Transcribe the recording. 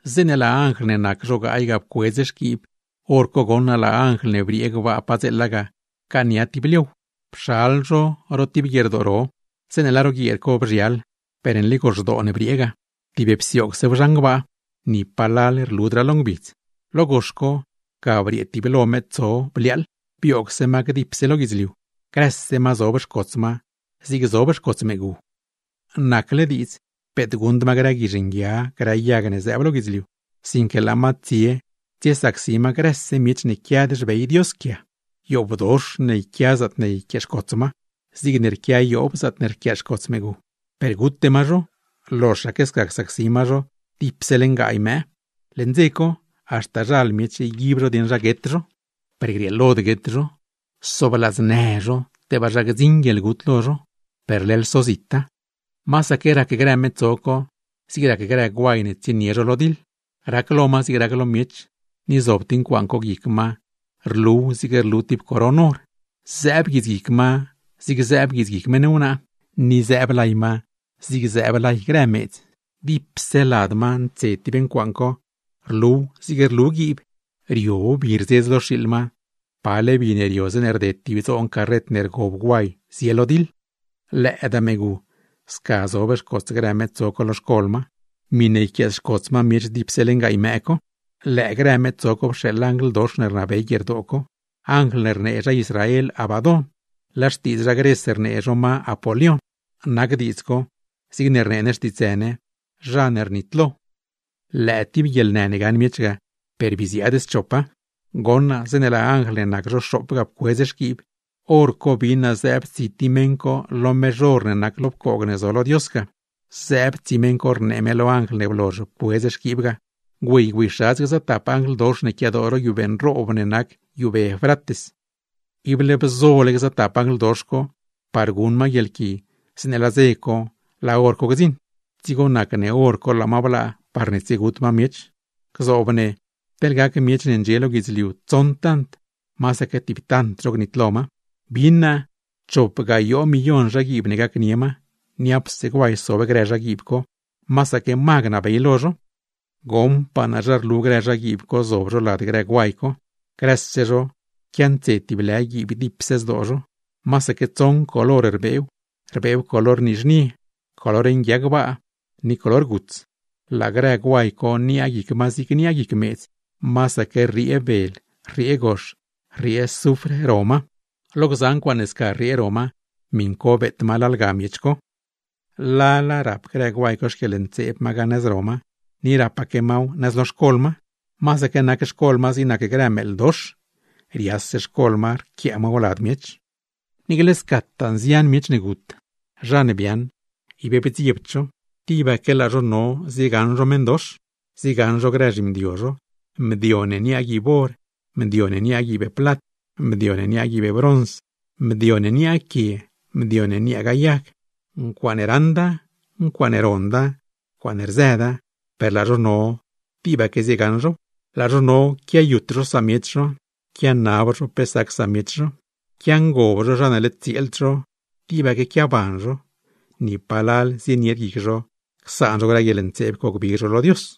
Zeeṉe laa anjl ne nac zho gaay ga pcuedz xquiib, hor co goṉ naa laa anjl ne briee gbaa padzeela ga pcaania tib liow, pxal zho ro tib guierdoo ro. Zeeṉe laa ro guieer co bzhial, per nli goxdoo ne briee ga, tib psioogsew zhan gbaa, per ni palal rludraa lo ngbidz. Lo gox co, ga briee tiblo metso bliaaḻ, bioogse ma gdipse lo guidzliu, grëse ma zob xcots ma, zig zob xcots meegu. Nacle diidz, peet guṉd ma grë guizh nguia, grë yag ne zëëb lo guidzliu, sinque laa ma tsie tsiesacsi ma grëse miech ne quiad xbey Dios quia. Yoobdox ne yquia zaatne yquiaaxcots ma, zigne rquia yoob zaatne rquiaaxcots meegu; per gute ma zho, loxaque sca csacsi ma zho dipse leṉ gaay mëë. Leṉ dze co, haxta zhal miech yguib zho dieṉ zha guet zho, per grieelod guet zho; soobladznë zho, tebaa zha gdziṉ guieḻgut lo zho, per leḻ sozita. Masaque rac grë metso co zig rac grë guay ne tsienie zho lo diḻ. Rac lo ma zig rac lo miech, ni zob tib ncuaaṉ co guic ma, rluw zig rlu tib coron or; zëëb guitsguic ma zig zëëb guitsguic meṉ wnaa, ni zëëb lay ma zig zëëb lay grë meedz. Dipse lad ma ntse tib ncuaaṉ co, rluw zig rlu guiib; rio bi rzedz lo xiiḻ ma, pale bi ne rio zeeṉe rded tib dzoon carret ne rgob guay, zie lo diḻ. Lëëdaa meegu, sca zob xcots grë metso co lo xcol ma, miṉe yquiaaxcots ma miech dipse leṉ gaay mëë co. Lëë grë metso co pxeeḻ anjl dox ne rnabey guierdoo co, anjl ne rnee zha Israel Abadón, laa xtiidz zha Gres rnee zho ma Apolión. (Nac diidz co, zig rnee ne xtiitsë ne: Zha ne rnitlo.) Lëë tib guieḻnë ne gaṉ miech ga, per bii ziaad schopa. Goṉ naa zeeṉe laa anjl ne nac zho xoop ga pcuedz xquiib, hor co bin naa zëëb tsi tib meṉ co lo mezh or ne nac lo pcoog ne zo lo Dios ga. Zëëb tsi meṉ co rnee me lo anjl ne blozh pcuedz xquiib ga: ―Güey, güeyxadz gza tap anjl dox ne quiadoo ro guiubee nroob ne nac guiubee Eufrates. Ible bzole gza tap anjl dox co par guṉ ma guieḻqui zeeṉe laa dze co, laa hor co gdziṉ; dzigo nac ne hor co laa ma blaa, parne tsiegut ma miech. Gzoob ne teḻne gac miech ne ndxie lo guidzliu tsoṉ tant, masaque tib tant zho gnitlo ma. Bin naa chop gayoo millon zhaguiib ne gacnie ma, niapse guay sob grë zhaguiib co; masaque ma gnabey lo zho. Goṉpaa naa zha rlu grë zhaguiib co zob zho lad grë guay co. Grëse zho quiantse tib lë guiib gdipse zdoo zho; masaque tsoṉ color rbeew, rbeew color nizhnie, color nguia gbaa, ni color guts. Laa grë guay co, niaa guic ma zig niaa guic meedz, masaque rriee bel, rriee gox, rriee zufr ro ma; lo gza ncuaaṉ ne sca rriee ro ma, miṉ co beet lalga miech co. Lala rap grë guay co xquieḻntseeb ma ga nëz ro ma, ni rapaque maw nëz lo xcol ma; masaque nac xcol ma zig nac grë meeḻ dox, rias xcol ma rquiaa maw lad miech. Niicle scataa nzian miech ne gut, zha ne biaaṉ ib bdziebd zho. Tibaque laa zho no ziegaṉ zho meṉdox, ziegaṉ zho grë zhimdio zho, mdio ne niaa guiib or, mdio ne niaa guiib plat, mdio ne niaa guiib brons, mdio ne niaa quie, mdio ne niaagaa yag; ncuaaṉe raṉda, ncuaaṉe ronda, ncuaaṉe rzëda, per laa zho no tibaque ziegaṉ zhow. Laa zho no quiayut zho samiech zho, quianab zho pe sac samiech zho, quiangob zho zha ne led tsieeld zho, tibaque quiaban zho, ¡ni palal zienied guic zho csaan zho grë guieḻntseeb co gbig zho lo Dios!